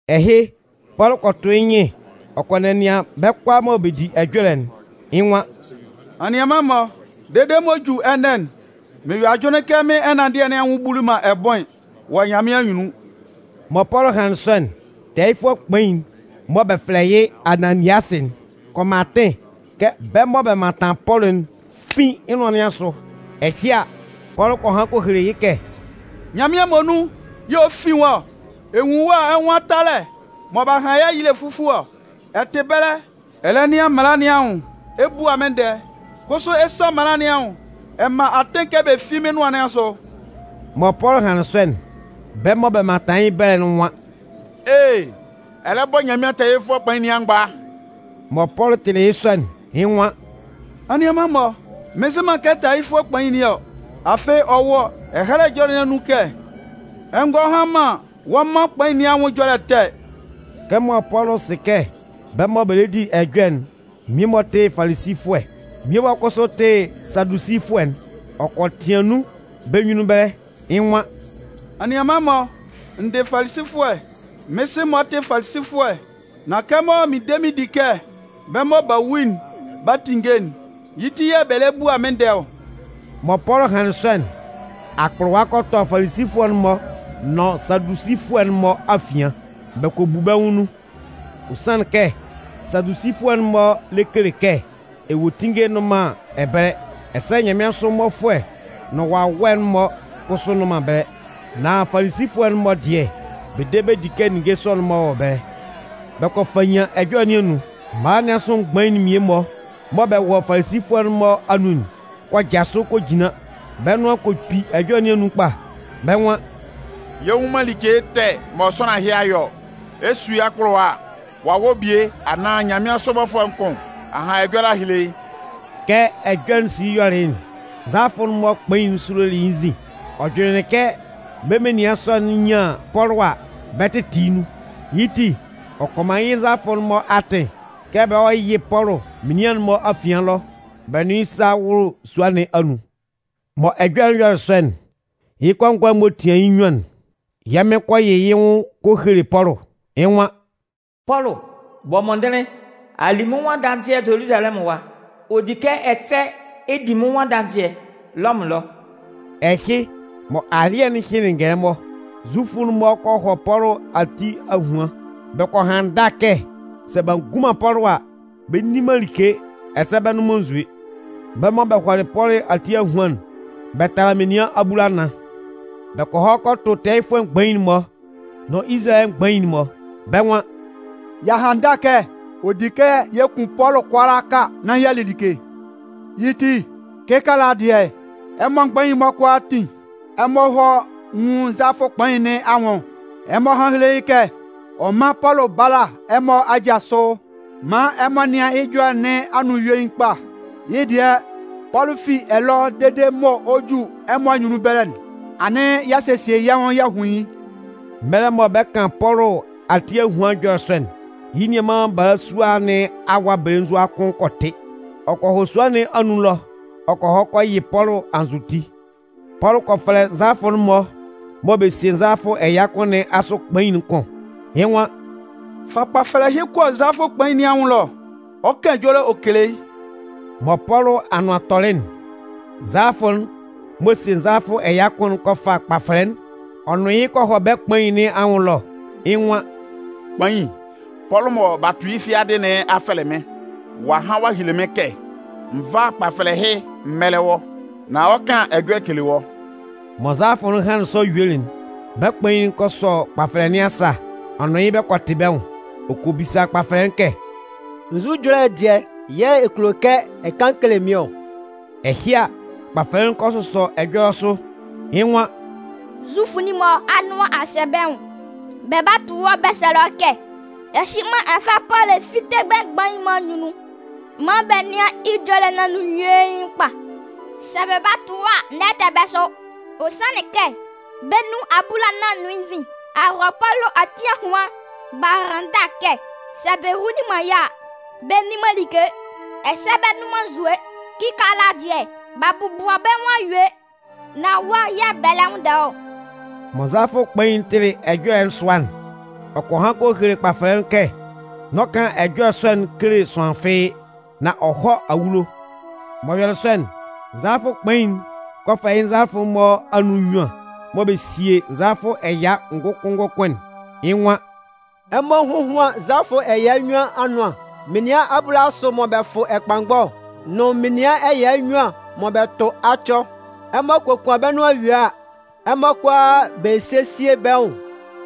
Ɛhɩ, Pɔlʋ kɔ tʋ yɩ́ nyɩn ɔ kɔ nɛnɩan bɛ́ kʋalaa mɔ bɛ di ɛjɔlɛ'n, yɩ́ nwan: “Anianman-mɔ, dede mɔ ɔ 'ju ɛnɛ'n, mɩn yɔ ajʋnlɩn kɛ mɩ́n ɛnanndɩɛ nɩn anwʋn buli man ɛbʋɩn wɔ Nyanmɩan anyunnun.” Mɔ Pɔlʋ hanlɩn sɔ'n, tɛɛyɩfʋɛ kpain'n mɔ bɛ fɛlɛ yɩ́ Ananiasɩ'n kɔ man atɩn kɛ bɛ́ mɔ bɛ mantan Pɔlʋ'n fín yɩ́ nʋan nɩn asʋ. Ɛhɩ a, Pɔlʋ kɔ han kɔ hele yɩ́ kɛ: “Nyanmɩan muonun yɛ̂ ɔ 'fin wɔ́. Ɛ nwun wɔ́ a ɛ nwan talɛ mɔ b'a han yɩ́ ayile fufue ɔ! Ɛ tɩ ɛbɛlɛ ɛ lɛ nɩan mala nɩn anwʋn ɛ bua mɩ́n ndɛɛ, kʋsʋ ɛ san mala nɩn anwʋn ɛ man atɩn kɛ bɛ fín mɩ́n nʋan nɩn asʋ!” Mɔ Pɔlʋ hanlɩn sɔ'n, bɛ́ mɔ bɛ mantan yɩ́ ɛbɛlɛ'n nwan: “Ee! Ɛ lɛ bɔ Nyanmɩan tɛɛyɩfʋɛ kpain nɩn amgba!” Mɔ Pɔlʋ tɩlɩ yɩ́ sɔ'n, yɩ́ nwan: “Anianman-mɔ, mɩn nzɩ man kɛ tɛɛyɩfʋɛ kpain nɩn ɔ. Afɩ ɔ wɔ Ɛhɛlɛ Ɛjɔlɛ nɩn anun kɛ: ‘Ɛ ngɔ han man wɔ́ mân kpain nɩn anwʋn ɛjɔlɛ ɛtɛ.’” Kɛmɔ Pɔlʋ sɩ kɛ bɛ́ mɔ bɛ lɛ di ɛjɔlɛ'n mmie-mɔ tɩ Falisifʋɛ, mmie-mɔ kʋsʋ tɩ Sadusifʋɛ'n, ɔ kɔ tɩan nun bɛ́ nyunnun ɛbɛlɛ. Yɩ́ nwan: “Anianman-mɔ, n dɩ Falisifʋɛ, mɩ́n sɩ-mɔ tɩ Falisifʋɛ. Nan kɛmɔ mɩn de mɩn di kɛ bɛ́ mɔ b'a wu'n 'ba tinnge'n, yɩ́ ti yɛ̂ bɛ lɛ bua mɩ́n ndɛɛ ɔ.” Mɔ Pɔlʋ hanlɩn sɔ'n, akpʋlʋwa kɔ tɔ Falisifʋɛ'n-mɔ nʋn Sadusifʋɛ'n-mɔ afian, bɛ kɔ bu bɛ́ nwʋn nun. Ɔ sanlɩn kɛ Sadusifʋɛ'n-mɔ lɛ kele kɛ ewuetinnge nnʋn man ɛbɛlɛ, ɛsɛ nyanmɩansʋ mmɔfʋɛ nʋn wawɛ'n-mɔ kʋsʋ nnʋn man ɛbɛlɛ. Nan Falisifʋɛ'n-mɔ dɩɛ, bɛ de bɛ di kɛ ninnge sɔ'n-mɔ wɔ ɛbɛlɛ. Bɛ kɔ fannyan ɛjɔlɛ nɩn anun. Mala nɩn asʋ mgbain'n mmie-mɔ mɔ bɛ wɔ Falisifʋɛ'n-mɔ anun'n kɔ jasʋ kɔ jinlan, bɛ́ nʋan kɔ kpi ɛjɔlɛ nɩn anun kpa. Bɛ́ nwan: “Yɛ nnwun man like ɛtɛ mɔ sʋanlan ɛhɩ a yɔ ɔ. Ɛ 'su yɩ́ akpʋlʋwa a, wawɛ bie anaan nyanmɩansʋ bɔfʋɛ kʋn a han ɛjɔlɛ a hele yɩ́!” Kɛ ɛjɔlɛ'n sili yɔlɩ yɩ́'n, nzalafʋɛ'n-mɔ kpain'n sulolɩ yɩ́ nzin. Ɔ jʋnlɩnlɩn kɛ bɛ́ menian sɔ'n nyan Pɔlʋ a, bɛ 'tɩtɩ yɩ́ nun. Yɩ́ ti, ɔ kɔ man yɩ́ nzalafʋ'n-mɔ atɩn kɛ bɛ hɔ́ yɩ́ Pɔlʋ menian'n-mɔ afian ɛlɔ bɛ nʋn yɩ́ sá wʋ́lʋ sua nɩn anun. Mɔ ɛjɔlɛ'n yɔlɩ sɔ'n, yɩ́ kɔngɔɛ m'ɔ tian yɩ́ nnyuan'n, yɛ́ Mɩn kɔ yɩ yɩ́ nwʋn kɔ hele Pɔlʋ. Yɩ́ nwan: “Pɔlʋ, bɔ mɔndɩnlɩn! A li mɩ́n nwʋn adanzɩɛ Zoluzalɛmʋn ɛwa, ɔ di kɛ ɛsɛ ɛ di mɩ́n nwʋn adanzɩɛ Lɔmʋn ɛlɔ.” Ɛhɩ, mɔ alɩ́ɛ hɩnlɩn'n ngɛlɛmɔ, Zufʋ'n-mɔ kɔ hɔ Pɔlʋ ati ahuan. Bɛ kɔ han ndâ kɛ sɛ b'a ngun man Pɔlʋ a, bɛ nni man like ɛsɛ bɛ nnʋn man nzue. Bɛ́ mɔ bɛ hɔlɩ Pɔlʋ ati ahuan'n, bɛ tala menian abulanan. Bɛ kɔ hɔ kɔ tʋ tɛɛyɩfʋɛ mgbain'n-mɔ nʋn Izalayɛ mgbain'n-mɔ, bɛ́ nwan: “Y'a han ndâ kɛ ɔ di kɛ yɛ kun Pɔlʋ kʋalaaka nán y'a li like. Yɩ́ ti, kɩkaala dɩɛ, ɛmɔ mgbain'n-mɔ kʋalaatin, ɛmɔ hɔ́ nwún nzalafʋ kpain nɩn anwʋn. Ɛmɔ hán héle yɩ́ kɛ ɔ mán Pɔlʋ bála ɛmɔ aja sʋ maan ɛmɔ nɩ́an yɩ́ ɛjɔlɛ nɩn anun yuein kpa. Yɩ́ dɩɛ, Pɔlʋ fi ɛlɔ dede mɔ ɔ 'ju ɛmɔ anyunnun ɛbɛlɛ'n, anɩn y'a sesie yɛ́ nwʋn y'a hun yɩ́.” Mɛlɛ mɔ bɛ 'kan Pɔlʋ ati ahuan ɛjɔlɛ sɔ'n, yɩ́ nianman balasua nɩn awa belenzua kʋn kɔ tɩ. Ɔ kɔ hɔ sua nɩn anun ɛlɔ ɔ kɔ hɔ kɔ yɩ Pɔlʋ anzʋti. Pɔlʋ kɔ fɛlɛ nzalafʋ'n-mɔ mɔ bɛ sie nzalafʋ ɛya kʋn nɩn asʋ kpain'n kʋn. Yɩ́ nwan: “Fa kpafɛlɛ ɛhɩ kɔ nzalafʋ kpain nɩn anwʋn ɛlɔ. Ɔ 'kan ɛjɔlɛ ɔ kele yɩ́.” Mɔ Pɔlʋ anʋan tɔlɩ'n, nzalafʋ'n m'ɔ sie nzalafʋ ɛya kʋn'n kɔ fa kpafɛlɛ'n ɔ nʋn yɩ́ kɔ hɔ bɛ́ kpain nɩn anwʋn ɛlɔ. Yɩ́ nwan: “Kpain, Pɔlʋ mɔ b'a tʋ yɩ́ fiadɩ nɩn a fɛlɛ mɩ́n ɔ a han ɔ'a hele mɩ́n kɛ n vá kpafɛlɛ ɛhɩ m mɛ́lɛ wɔ́, nán ɔ 'kan ɛjɔlɛ ɔ kele wɔ́.” Mɔ nzalafʋ'n hanlɩn sɔ yuelɩ'n, bɛ́ kpain'n kɔ sɔ kpafɛlɛ nɩn asa ɔ nʋn yɩ́ bɛ kɔ tɩ bɛ́ nwʋn. Ɔ kɔ bisa kpafɛlɛ'n kɛ: “Nzʋ ɛjɔlɛ dɩɛ yɛ̂ ɛ kulo kɛ ɛ kan kele mɩ́n ɔ?” Ɛhɩ a, kpafɛlɛ'n kɔ sʋsɔ ɛjɔlɛ sʋ, yɩ́ nwan: “Zufʋ'n-mɔ anʋan a sɛ bɛ́ nwʋn. Bɛ 'ba a tʋ wɔ́ bɛ sɛlɛ wɔ́ kɛ ɛhɩnman ɛ fá Pɔlʋ ɛ fíte bɛ́ mgbain'n-mɔ anyunnun maan bɛ nɩ́an yɩ́ ɛjɔlɛ nɩn anun yuein kpa. Sɛ bɛ ba a tʋ wɔ́ a, n'ɛ tɛ bɛ́ sʋ. Ɔ sanlɩn kɛ, bɛ́ nun abulanan nʋn yɩ́ nzin a hɔ Pɔlʋ ati ahuan b'a han ndâ kɛ sɛ bɛ hunlin man yɩ́ a, bɛ nni man like ɛsɛ bɛ nnʋn man nzue. Kɩkaala dɩɛ, b'a bɔbʋa bɛ́ nwʋn a yue, nan wɔ́ yɛ̂ bɛ lɛ nwʋnndɛ wɔ́ ɔ.” Mɔ nzalafʋ kpain'n tɩlɩ ɛjɔlɛ'n sʋa'n, ɔ kɔ han kɔ hele kpafɛlɛ'n kɛ n'ɔ kan ɛjɔlɛ sɔ'n kele sʋanlan fɩ́ɩ́, nan ɔ hɔ́ awulo. M'ɔ yɔlɩ sɔ'n, nzalafʋ kpain'n kɔ fɛlɛ yɩ́ nzalafʋ'n-mɔ anun nnyuan mɔ bɛ sie nzalafʋ ɛya ngʋkʋn ngʋkʋn'n. Yɩ́ nwan: “Ɛmɔ hóhuan nzalafʋ ɛya nnyuan anʋan, menian abulasʋ mɔ bɛ fʋ ɛkpanngɔ nʋn menian ɛya nnyuan mɔ bɛ tʋ acɔ. Ɛmɔ kokuan bɛ́ nʋan yue a, ɛmɔ kʋalaa sésie bɛ́ nwʋn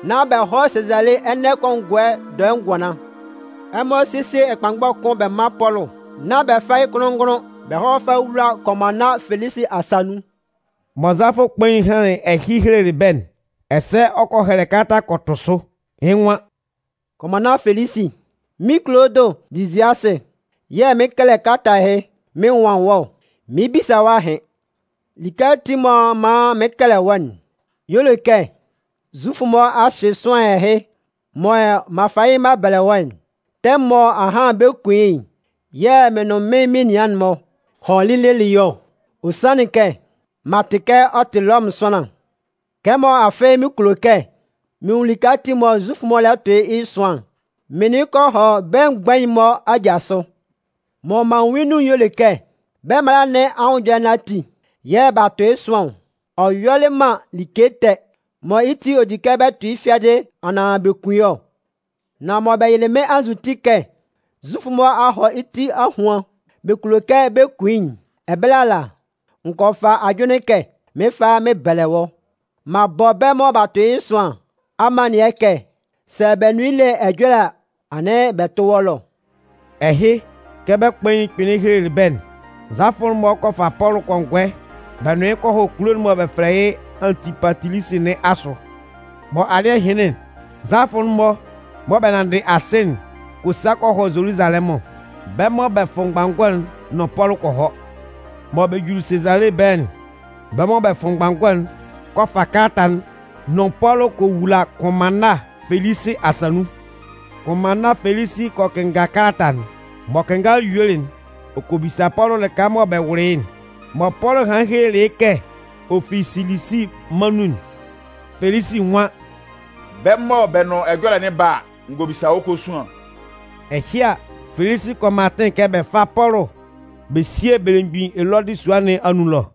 nán bɛ hɔ́ Sazale ɛnɛ kɔngɔɛ dɔɛ ngʋanlan. Ɛmɔ sésie ɛkpanngɔ kʋn bɛ mán Pɔlʋ, nán bɛ fá yɩ́ kʋnlʋn-ngʋnlʋn bɛ hɔ́ fá yɩ́ wúla kʋnmanna Felisi asa nun.” Mɔ nzalafʋ kpain'n hanlɩn ɛhɩ helelɩ bɛ́'n, ɛsɛ ɔ kɔ hɛlɛ kalata kɔ tʋ sʋ. Yɩ́ nwan: Kʋnmanna Felisi, Mɩ́n Kulodʋ Liziasɩ yɛ̂ mɩɩn kɛlɛ kalata ɛhɩ mɩn nwan wɔ́ ɔ. Mɩn 'bisa wɔ́ ahɩn. Like ati m'ɔ man mɩɩn kɛlɛ wɔ́'n y'ɔ le kɛ Zufʋ'n-mɔ a hyɩ sʋanlan ɛhɩ mɔ m'an fa yɩ́ m'an bɛlɛ wɔ́'n. Tɛmʋn mɔ ahan bɛ 'kun yɩ́'n yɛ̂ mɩn nʋn mɩ́n menian'n-mɔ hɔlɩ lelɩ yɩ́ ɔ. Ɔ sanlɩn kɛ m'an tɩ kɛ ɔ tɩ Lɔmʋn sʋanlan. Kɛmɔ afɩ mɩn kulo kɛ mɩn nwun like ati mɔ Zufʋ'n-mɔ lɛ tʋn yɩ́ ɛsʋan'n, mɩn nʋn yɩ́ kɔ hɔ bɛ́ mgbain'n-mɔ aja sʋ. Mɔ m'an nwun yɩ́ nun'n y'ɔ le kɛ bɛ́ mala nɩn anwʋn ɛjɔlɛ ati yɛ̂ b'a tʋn yɩ́ ɛsʋan ɔ. Ɔ yɔlɩ man like ɛtɛ mɔ yɩ́ ti ɔ di kɛ bɛ tʋ yɩ́ fiadɩ anaan bɛ kun yɩ́ ɔ. Nan mɔ bɛ yɩlɩ mɩ́n anzʋti kɛ Zufʋ'n-mɔ a hɔ yɩ́ ti ahuan bɛ kulo kɛ bɛ kun yɩ́'n, ɛbɛlɛ ala, n gɔ fa ajʋnlɩn kɛ mɩn 'fa yɩ́ mɩn bɛlɛ wɔ́. M'an bɔ bɛ́ mɔ b'a tʋn yɩ́ ɛsʋán nɩn amannɩɛ kɛ sɛ bɛ nʋn yɩ́ le ɛjɔlɛ a, anɩn bɛ tʋ́ wɔ́ ɛlɔ. Ɛhɩ, kɛ bɛ́ kpain'n kpɩnlɩn helelɩ bɛ́'n, nzalafʋ'n-mɔ kɔ fa Pɔlʋ kɔngɔɛ bɛ nʋn yɩ́ kɔ hɔ kulo'n mɔ bɛ fɛlɛ yɩ́ Antipatilisi nɩn asʋ. Mɔ alɩ́ɛ hɩnlɩn'n, nzalafʋ'n-mɔ mɔ bɛ nanndɩ asɩ'n kɔ sa kɔ hɔ Zoluzalɛmʋn. Bɛ́ mɔ bɛ fʋ mgbanngɔ'n nʋn Pɔlʋ kɔ hɔ. Mɔ bɛ juli Sezale ɛbɛlɛ'n, bɛ́ mɔ bɛ fʋ mgbanngɔ'n kɔ fa kalata'n nʋn Pɔlʋ kɔ wula Kʋnmanna Felisi asa nun. Kʋnmanna Felisi kɔ kɩnnga kalata'n. M'ɔ kɩnngalɩ yuelɩ'n, ɔ kɔ bisa Pɔlʋ lɩka mɔ bɛ wʋlɩ yɩ́'n. Mɔ Pɔlʋ hanlɩn helelɩ yɩ́ kɛ ɔ fi Silisi mân nun'n, Felisi nwan: “Bɛ́ mɔ bɛ nʋn wɔ́ le ɛjɔlɛ'n 'ba a, n gɔ bisa wɔ́ kosuan.” Ɛhɩ a, Felisi kɔ man atɩn kɛ bɛ fá Pɔlʋ bɛ síe belemgbin Elɔdɩ sua nɩn anun ɛlɔ.